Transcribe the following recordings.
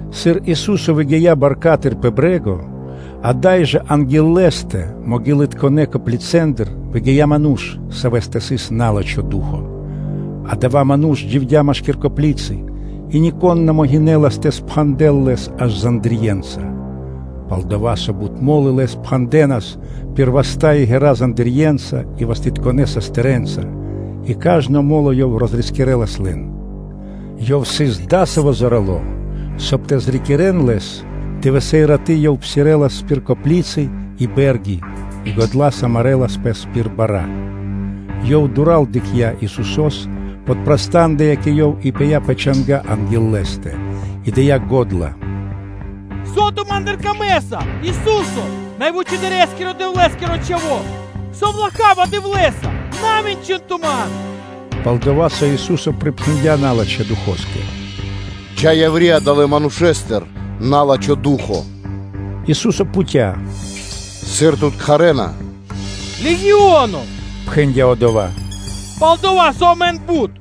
Сыр Ису́со выгия́ баркатыр пэ брэ́го, ада́й жэ анги́л Лэ́стэ маґилытконэ коплицэндыр выгия́ ману́ш, савэ́стэ сыс на́лачхо ду́хо (фа́но). Адава́ ману́ш дживдя́ машки́р коплицы. И нико́н на могинэлас тэ пхандэл лэс аж зандирьенца (цэпэнца) Пал-дова́ со бут мо́лы лэс пхандэнас пир васта́ и ґэра́ зандирьенца и вастытконэ састырэнца, и кажно мо́ло ёв розрискирэлас лэн. Ёв сыс адасаво́ зорало́, соб (кай) тэ зрикирэн лэс. Дывэсэ́ и раты́, ёв псирэлас пир коплицы и бэ́рги, и годла́са марэлас пэс пир бара́. Ёв дура́л дыкхця́ Исусо́с, подпрастандыя кэ Ёв и пыя́ пэ чанга́ анги́л Лэ́стэ; и дыя́ го́дла зоралэ́с: “Со Ту́кэ трэй ма́ндыр, Ису́се, Най Вучэдырэскиро Дэвлэ́скиро Чхаво́! Совлаха́ Дэвлэ́са, со на мэнчынэса Ту ман?” Пал-дова́ со Ису́со припхэндя́ налачхэ́ духоскэ: “Джа́ яври́ адалэ́ манушэ́стыр, на́лачхо ду́хо (фа́но)!” Ису́со пхуця́: “Сыр тут кхарэ́на?” “Легионо – пхэндя́ одова́, – пал-дова́ со амэн исын бут.”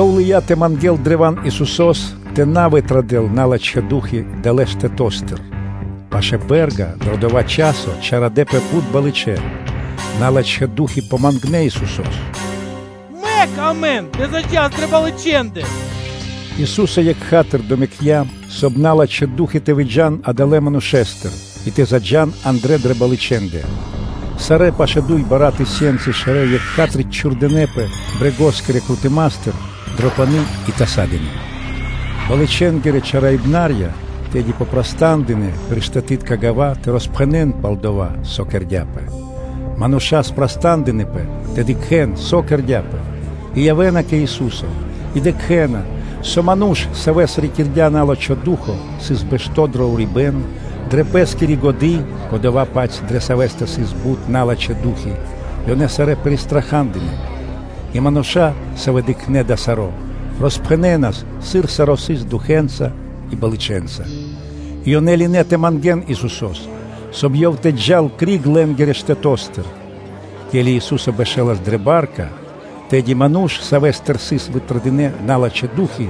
Ёв лыя́ древа́н тэ мангэ́л Исусо́с тэ на вытрадэл налачхэ́ ду́хи далэ́ штэто́стыр. Пашы́л бэ́рга дро дава́ часо чарадэпэ бут балычэ, налачхэ́ ду́хи помангнэ Исусо́с: “Мэк амэн тэ заджас дрэ балычэндэ.” Ису́со екха́тыр (тотчас) домэкця, соб (кай) налачхэ́ ду́хи (фаны) тэ выджа́н адалэ́ манушэ́стыр и тэ заджа́н андрэ́ дрэ балычэндэ. Сарэ́ пашэ́ дуй бара́ (тысёнцы) шэрэ́ екха́тыр (сра́зу) чхурдынэпэ брэгоскирэ крутыматыр дро пани́ и тасадынэ. Балычэнгирэ чараибнарья тэды попрастандынэ пир штэтытка гава́ тэ роспхэнэ́н пал дова́, со кэрдя́пэ. Э мануша́ гинэ́ тэ дыкхэ́н, со кэрдя́пэ. И явэ́на кэ Ису́со и дыкхэ́на, со ману́ш, савэ́с рикирдя на́лачхо ду́хо (фа́но), сыс бэшто́ дро урибэ́н, дрэ пэ́скири годы́; кодова́-паць, дрэ савэ́стэ сыс бут налачхэ́ ду́хи. Ёнэ сарэ́ пиристрахадынэ. И мануша́, савэ́ дыкхнэ́ дава́ саро́, роспхэнэнас, сыр саро́ сыс духэнца и балычэнца. И ёнэ лынэ́ тэ мангэ́н Исусо́с, соб (кай) Ёв тэ джал криг лэ́нгирэ штэто́стыр. Ке́ли Ису́со бэшэлас дрэ ба́рка, тэды ману́ш, савэ́стыр сыс вытрадынэ́ налачхэ́ ду́хи,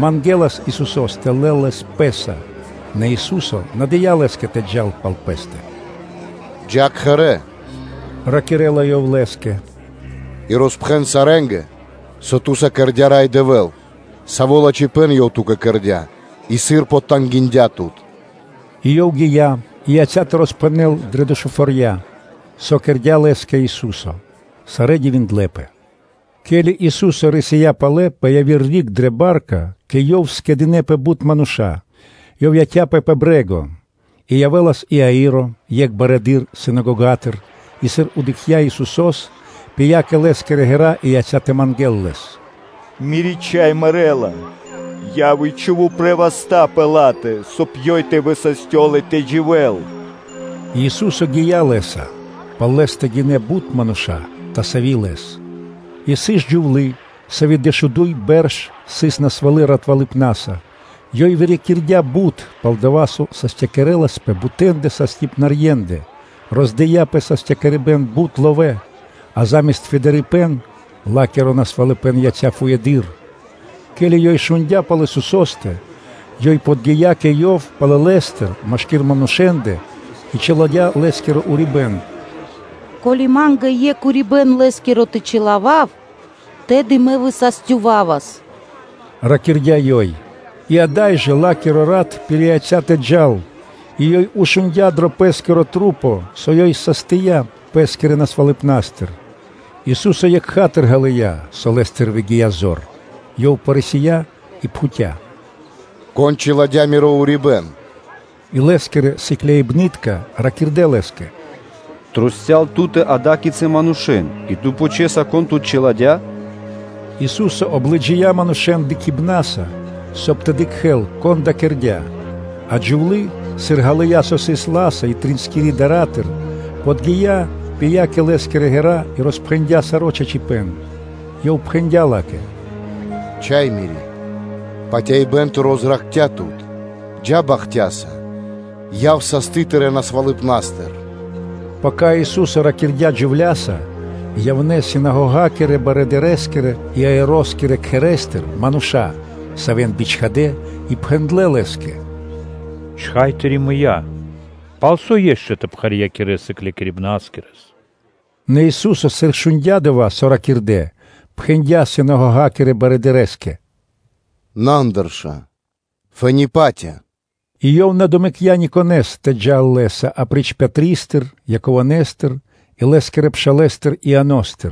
мангэлас Исусо́с тэ лэл лэс Пэ́са. Нэ Ису́со на дыя́ лэ́скэ тэ джал пал Лэ́стэ. “Джа́ кхэрэ́ – ракирэ́ла Ёв лэ́скэ”, – и роспхэн сарэ́нгэ, со ту́са кэрдя́ Рай Дэвэ́л, саво́ лачхипэ́н Ёв ту́кэ кэрдя́ и сыр потангиндя тут.’” И ёв гия́ и яця́ тэ роспхэнэл дрэ Дэшуфорья, со кэрдя́ лэ́скэ Ису́со. Сарэ́ дивиндлэ́пэ. Ке́ли Ису́со рисия́ палэ пэ яви́р риг дрэ ба́рка, кэ Ёв скэдынэ́пэ бут мануша́. Ёв яця́пэ пэ брэ́го. И явэ́лас Иаиро, екх барыдыро́ синагогатыр, и, сыр дыкхця́ Исусо́с, то пыя́ кэ Лэ́скирэ ґэра́, и яця́ тэ мангэ́л Лэс: “Мири́ чхай мэрэ́ла, яв и чхув упрэ́ васта́ пэ ла́тэ, соб (кай) ёй тэ высастёл и тэ дживэ́л!” И Ёв (Ису́со) гия́ лэ́са; пал Лэ́стэ гинэ́ бут мануша́, тасави Лэс. И сыс джувлы́, сави́ дэшуду́й бэрш сыс насвалы ратвалыпнаса, ёй вырикирдя бут, пал-дова́ со састякирэласпэ бутэндэ састыпнарьендэ (докторэндэ), роздыя пэ састякирибэн бут ловэ́, а заме́ст фэдырипэн, ла́киро насвалыпэн яця́ фуеды́р. Ке́ли ёй шундя́ пал Исусо́стэ, ёй подги́я кэ Ёв палалэстыр машки́р манушэ́ндэ и чиладя́ Лэ́скиро урибэ́н; “Ко́ли Ма́нгэ екх урибэ́н Лэ́скиро тэ чилавав, тэды мэ высастёвавас”, – ракирдя́ ёй; и ада́й жэ ла́киро рат пирияця́ тэ джал, и ёй шундя́ дро пэ́скирэ маса́, со ёй састия пэ́скирэ насвалыпнастыр. Ису́со екха́тыр ґалыя́, со Лэ́стыр выгия́ зор, Ёв рисия и пхуця́: “Кон чиладя́ Миро урибэ́н?” И Лэ́скирэ сыкляибны́тка ракирдэ́ Лэ́скэ: “Трусця́л (кругом) Ту́тэ исын ада́кицы мануша́ и Ту пхучэса, кон Тут чиладя́?” Ису́со облыджия манушэ́н дыкхибнаса, соб (кай) тэ дыкхэ́л, кон дава́ кэрдя́. А джувлы́, сыр ґалыя́, со сыс ла́са и триинскири дара́тыр, подги́я, пыя́ кэ Лэ́скирэ ґэра́ и роспхэндя́ саро́ чачипэ́н. Ёв пхэндя́ ла́кэ: “Чха́е Мири́! Патяибэ́н тыро́ зракхця́ тут! Джа́ бахтяса, яв састы тырэ́ насвалыпнастыр.” Пака Ису́со ракирдя́ джувля́са, явнэ́ синагогакирэ-барыдырэскирэ Иаироскирэ кхэрэ́стыр мануша́, савэ́н бичхадэ́, и ракирэ́на Лэ́скэ: “Чхай Тыри́ мыя́, палсо́ ишчо (инкэ́) тэ пхарьякирэс Сыклякирибнаскирэс?” Нэ Ису́со, сыр шундя́ дова́, со ракирдэ́, пхэндя́ синагогакирэ барыдырэ́скэ: “На андырша, фэ́ни (то́ка) патя!” И Ёв на домэкця никонэ́с тэ джал Лэ́са, апри́ч Пэтристэ, Яковостэ и лэ́скирэ пшалэ́стэ Ианостэ.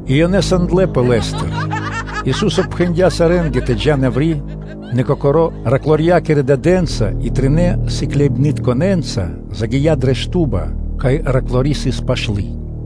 И ёнэ сандлэпэ Лэ́стыр. Ису́со пхэндя́ сарэ́нгэ тэ джа́н яври́, нэ Кокоро́ Ёв патывалэ́-тэрнэ́-джувлякирэ дадэ́нца и тринэ́ сыкляибнытконэ́нца загия́ дрэ шту́ба, кай патывалы́ тэрны́ джувлы́ сыс пашты.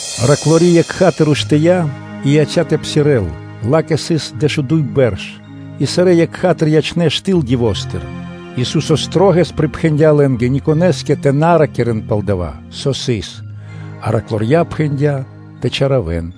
Патывалы́ тэрны́ джувлы́ екха́тыр уштыя́ и яця́ тэ псирэ́л; ла́кэ сыс дэшуду́й бэрш. И сарэ́ екха́тыр ячнэ́ штыл дивостыр. Ису́со шылалэс припхэндя́ лэ́нгэ никонэ́скэ тэ на ракирэ́н пал дава́, со сыс; а патываля-тэрня-джувля́ пхэндя́ тэ чалякирэн.